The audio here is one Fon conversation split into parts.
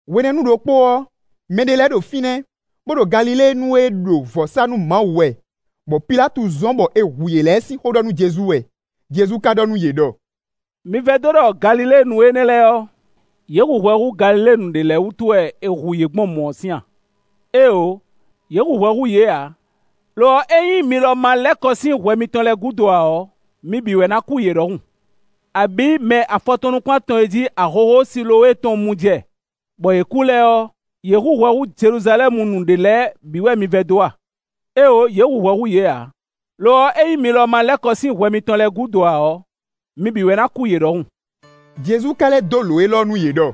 Hwenɛ́nu ɖokpó ɔ́, mɛɖé lɛ́ɛ ɖo fínɛ́, bó ɖo Galiléenu e ɖo vɔ̌ sá nú Mawu wɛ, bɔ Pilátu zɔ́n bɔ è hu yě lɛ́ɛ sín xó ɖɔ nú Jezu wɛ. Jezu ka ɖɔ nú yě ɖɔ: “Mi vɛdó ɖɔ Galiléenu énɛ́ lɛ́ɛ ɔ́, yě hu hwɛ hú Galiléenu ɖě lɛ́ɛ wútu wɛ è hu yě gbɔn mɔ̌ sín a? Éeǒ, yě hu hwɛ hú yě ǎ; lo ɔ́, ényí mi lɔ ma lɛ́ kɔ sín hwɛ mitɔn lɛ́ɛ gúdo ǎ ɔ́, mi bǐ wɛ ná kú yě ɖɔhun. Abǐ, mɛ afɔtɔn nukún-atɔn e jí ahohó Silowée tɔn mu jɛ, bɔ yě kú lɛ́ɛ ɔ́, yě hu hwɛ hú Jeluzalɛ́munu ɖě lɛ́ɛ bǐ wɛ mi vɛdó a? Éeǒ, yě hu hwɛ hú yě ǎ; lo ɔ́, ényí mi lɔ ma lɛ́ kɔ sín hwɛ mitɔn lɛ́ɛ gúdo ǎ ɔ́, mi bǐ wɛ ná kú yě ɖɔhun.” Jezu ka lɛ́ dó lǒ élɔ́ nú yě ɖɔ: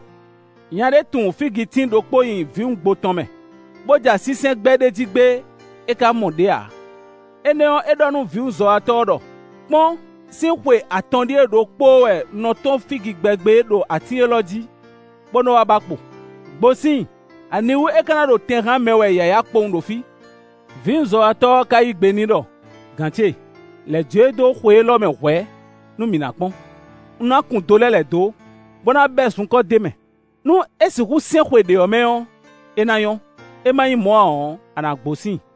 “Nya ɖé tun fígitín ɖokpó nyi vǐwungbo tɔn mɛ, bó ja sínsɛ́n gbɛ ɖ'é jí gbé, é ka mɔ ɖě ǎ. Énɛ́ ɔ́, é ɖɔ nú vǐwunzɔ́watɔ́ ɔ́ ɖɔ: ‘Kpɔ́n, sín xwe atɔn ɖíe ɖokpóó wɛ un nɔ tɔ́n fígi gbɛ gbé ɖo atín élɔ́ jí, bó nɔ́ wá ba kpo. Gbo sín i! Aniwú é ka ná ɖo tɛn hán mɛ wɛ yǎyá kpowun ɖo fí?’ Vǐwunzɔ́watɔ́ ɔ́ ka yí gbe n'i ɖɔ: ‘Gǎn ce! Lɛ̌ jó e dó xwe élɔ́ mɛ hwɛ̌ nú mǐ ná kpɔ́n. Un ná kun do lɛ́ lɛ̌ dó, bó ná bɛ́ zunkɔ́ d'é mɛ; nú é sixú sɛ́n xwe ɖě ɔ́ mɛ ɔ́, é ná nyɔ́; é má nyí mɔ̌ ǎ ɔ́, a nǎ gbo sín i.’”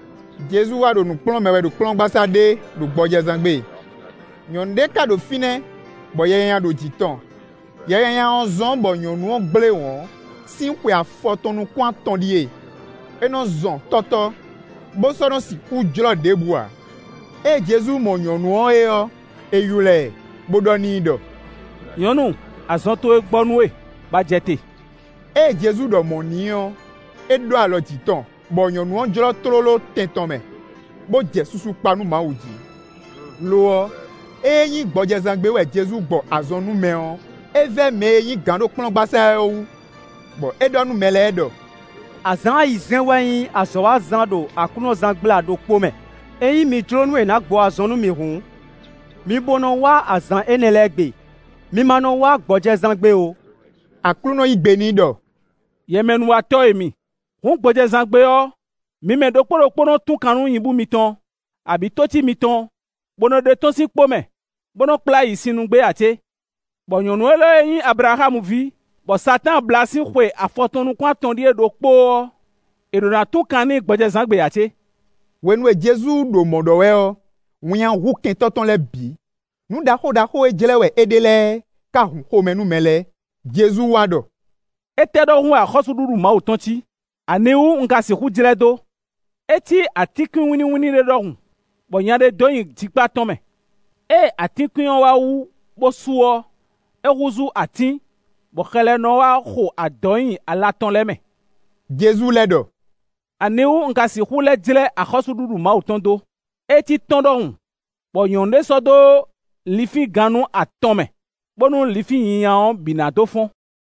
Jezu wá ɖo nǔ kplɔ́n mɛ wɛ ɖo kplɔ́ngbasá ɖé ɖo gbɔjɛzán gbe. Nyɔ̌nu ɖé ka ɖo fínɛ́, bɔ yɛ nyanya ɖo jǐ tɔn. Yɛ nyanya ɔ́ zɔ́n bɔ nyɔ̌nu ɔ́ gblé wɔ̌n, sín xwe afɔtɔn nukún-atɔn ɖíe; é nɔ́ zɔn tɔ́tɔ́, bó sɔ́ nɔ́ sixú jlɔ́ ɖěbǔ ǎ. Ée Jezu mɔ nyɔ̌nu ɔ́ é ɔ́, é ylɔ́ ɛ, bó ɖɔ n'i ɖɔ: “Nyɔ̌nu, azɔn towe gbɔ nú we, bɔ a jɛ te.” Ée Jezu ɖɔ mɔ̌ n'i ɔ́, é ɖó alɔ jǐ tɔn, bɔ nyɔ̌nu ɔ́ jlɔ́ tlóló tɛn tɔn mɛ, bó jɛ susu kpa nú Mawu jí. Lo ɔ́, ée é nyí gbɔjɛzán gbe wɛ Jezu gbɔ azɔn nú mɛ ɔ́, é vɛ́ mɛ e nyí gǎn ɖo kplɔ́ngbasá ɔ́ é wú, bɔ é ɖɔ nú mɛ lɛ́ɛ ɖɔ: “Azǎn ayizɛ́n wɛ nyí azɔ̌wazán ɖo aklúnɔzángbla ɖokpó mɛ. Ényí mi jló nú è nǎ gbɔ azɔn nú mi hǔn, mi bo nɔ wá azǎn énɛ́ lɛ́ɛ gbe; mi ma nɔ wá gbɔjɛzán gbe ó.” Aklúnɔ yí gbe n'i ɖɔ: “Yɛmɛnúwatɔ́ e mi! Hǔn gbɔjɛzán gbe ɔ́, mi mɛ ɖokpó ɖokpó nɔ́ tún kan nú nyibú mitɔn, abǐ tócí mitɔn, bó nɔ́ ɖe tɔ́n sín kpó mɛ, bó nɔ́ kplá yi sin nu gbé ǎ cé? Bɔ nyɔ̌nu élɔ́ e nyí Ablaxámu ví, bɔ Satáan blá sín xwe afɔtɔn-nukún-atɔn ɖíe ɖokpóó ɔ́, è ɖo na tún kan n'i gbɔjɛzán gbe ǎ cé?” Hwenu e Jezu ɖo mɔ̌ ɖɔ wɛ ɔ́, winnyá hu kɛntɔ́ tɔn lɛ́ɛ bǐ. Nǔ ɖaxó ɖaxó e jlɛ́ wɛ é ɖe lɛ́ɛ ká hun xomɛ nú mɛ lɛ́ɛ. Jezu wá ɖɔ: “Étɛ́ ɖɔhun wɛ axɔ́súɖuɖu Mawu tɔn cí? Aniwú un ka sixú jlɛ́ dó? É cí atínkwín wínníwínní ɖé ɖɔhun, bɔ nya ɖé dó nyi jikpá tɔn mɛ; ée atínkwín ɔ́ wá wú bó su ɔ́, é húzú atín, bɔ xɛ lɛ́ɛ nɔ wá xo adɔ̌ nyi ala tɔn lɛ́ɛ mɛ.” Jezu lɛ́ ɖɔ: “Aniwú un ka sixú lɛ́ jlɛ́ axɔ́súɖuɖu Mawu tɔn dó? É cí tɔ́n ɖɔhun, bɔ nyɔ̌nu ɖé sɔ́ dó linfín gannú atɔn mɛ, bónú linfín nyinya ɔ́ bǐ ná dó fɔ́n.”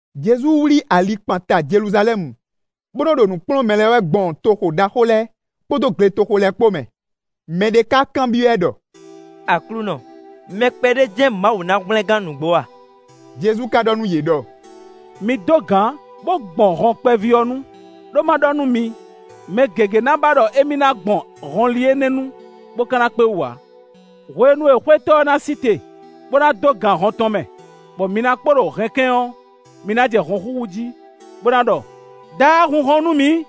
Jezu wlí ali kpan ta Jeluzalɛ́mu, bó nɔ ɖo nǔ kplɔ́n mɛ lɛ́ɛ wɛ gbɔn toxo ɖaxó lɛ́ɛ, kpódó gletoxo lɛ́ɛ kpó mɛ. Mɛ ɖé ka kanbyɔ́ ɛ ɖɔ: “Aklúnɔ, mɛ kpɛɖé jɛ́n Mawu ná hwlɛ́n gán nǔgbó a?” Jezu ka ɖɔ nú yě ɖɔ: “Mi dó gǎn, bó gbɔn hɔn kpɛví ɔ́ nu; ɖó má ɖɔ nú mi, mɛ gěgé na ba ɖɔ émí ná gbɔn hɔnli énɛ́ nu, bó ka ná kpé wú ǎ. “Hwenu e xwétɔ́ ɔ́ ná sí te, bó ná dó gan hɔn tɔn mɛ, bɔ mi ná kpo ɖo hɛnkɛ́n ɔ́, mi ná jɛ hɔn xúxú jí, bó ná ɖɔ: ‘Daá, hun hɔn nú mǐ!’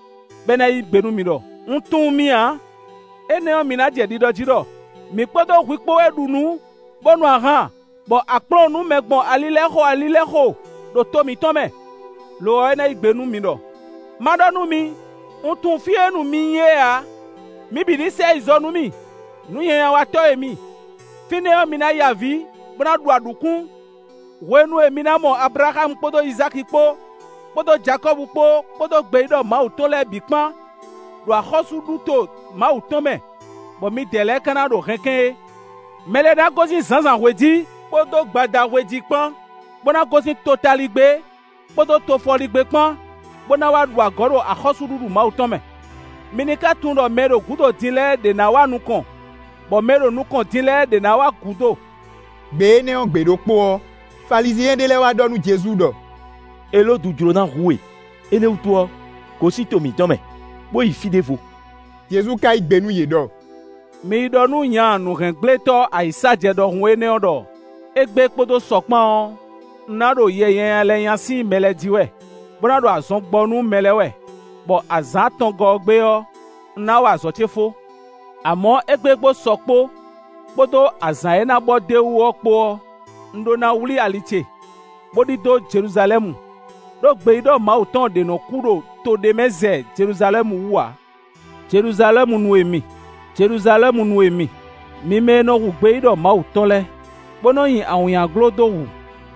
Bɔ é ná yí gbe nú mi ɖɔ: ‘Un tunwun mi ǎ.’ Énɛ́ ɔ́, mi ná jɛ ɖiɖɔ jí ɖɔ: ‘Mǐ kpódó hwi kpó wɛ ɖu nǔ, bó nu ahan, bɔ a kplɔ́n nǔ mɛ gbɔn ali lɛ́ɛ xo, ali lɛ́ɛ xo ɖo to mitɔn mɛ.’ Lo ɔ́, é ná yí gbe nú mi ɖɔ: ‘Má ɖɔ nú mi: Un tunwun fí e nu mi nyí é ǎ; mi bǐ ní sɛ yi zɔ nú mì, nǔnyanyawatɔ́ e mi.’ Fínɛ́ ɔ́, mi ná ya avǐ, bó ná ɖu aɖǔkún, hwenu e mi ná mɔ Ablaxámu kpódó Izáki kpó, kpódó Jakɔ́bu kpó, kpódó gbeyíɖɔ Mawu tɔn lɛ́ɛ bǐ kpán, ɖo axɔ́súɖuto Mawu tɔn mɛ, bɔ midɛɛ lɛ́ɛ ka ná ɖo hɛnkɛ́n é. Mɛ lɛ́ɛ ná gosín zǎnzǎnhwe jí, kpódó gbadahwe jí kpán, bó ná gosín totaligbé kpódó tofɔligbé kpán, bó ná wá ɖu agɔ̌ ɖo axɔ́súɖuɖu Mawu tɔn mɛ. Mi ní ka tunwun ɖɔ mɛ e ɖo gǔdo din lɛ́ɛ ɖě ná wá nukɔn, bɔ mɛ e ɖo nukɔn din lɛ́ɛ ɖě ná wá gǔdo.” Gbe énɛ́ ɔ́ gbe ɖokpó ɔ́, Falizyɛn ɖé lɛ́ɛ wá ɖɔ nú Jezu ɖɔ: “Elódu jló ná hu we; énɛ́ wútu ɔ́, gosín to mǐtɔn mɛ, bó yi fí ɖěvo.” Jezu ka yí gbe nú yě ɖɔ: “Mi yi ɖɔ nú nya nǔhɛngblétɔ́ ayǐsájɛ ɖɔhun énɛ́ ɔ́ ɖɔ égbé kpódó sɔ́ kpán ɔ́, un ná ɖo yɛ nyanya lɛ́ɛ nya sín mɛ lɛ́ɛ jí wɛ, bó ná ɖo azɔn gbɔ nú mɛ lɛ́ɛ wɛ, bɔ azǎn atɔngɔ́ ɔ́ gbe ɔ́, un ná wa azɔ̌ ce fó. Amɔ̌, égbé kpódó sɔ́ kpó, kpódó azǎn e ná bɔ d'é wú ɔ́ kpó ɔ́, un ɖó ná wlí ali ce, bó ɖidó Jeluzalɛ́mu; ɖó gbeyíɖɔ Mawu tɔn ɖě nɔ́ kú ɖo to ɖé mɛ zɛ Jeluzalɛ́mu wú ǎ. “Jeluzalɛ́munu e mi, Jeluzalɛ́munu e mi, mi mɛ e nɔ hu gbeyíɖɔ Mawu tɔn lɛ́ɛ, bó nɔ́ nyi awǐnnyaglo dó hu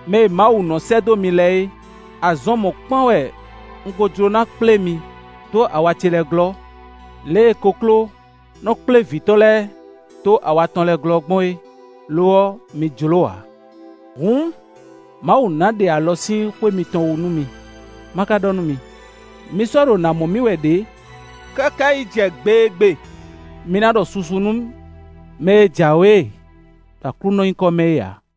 mɛ e Mawu nɔ́ sɛ́ dó mi lɛ́ɛ é! Azɔn mɔ̌kpán wɛ un ko jló ná kplé mi dó awa ce lɛ́ɛ glɔ́, lě e kokló nɔ́ kplé vǐ tɔn lɛ́ɛ dó awa tɔn lɛ́ɛ glɔ́ gbɔn é, lo ɔ́, mi jló ǎ. Hǔn, Mawu ná ɖe alɔ sín xwé mitɔn wú nú mi. Ma ka ɖɔ nú mi: mi sɔ́ ɖo nǎ mɔ mì wɛ ɖě, káká yi jɛ gbe e gbe mi ná ɖɔ susu nú mɛ e jǎwe ɖo Aklúnɔ nyíkɔ mɛ é ǎ.”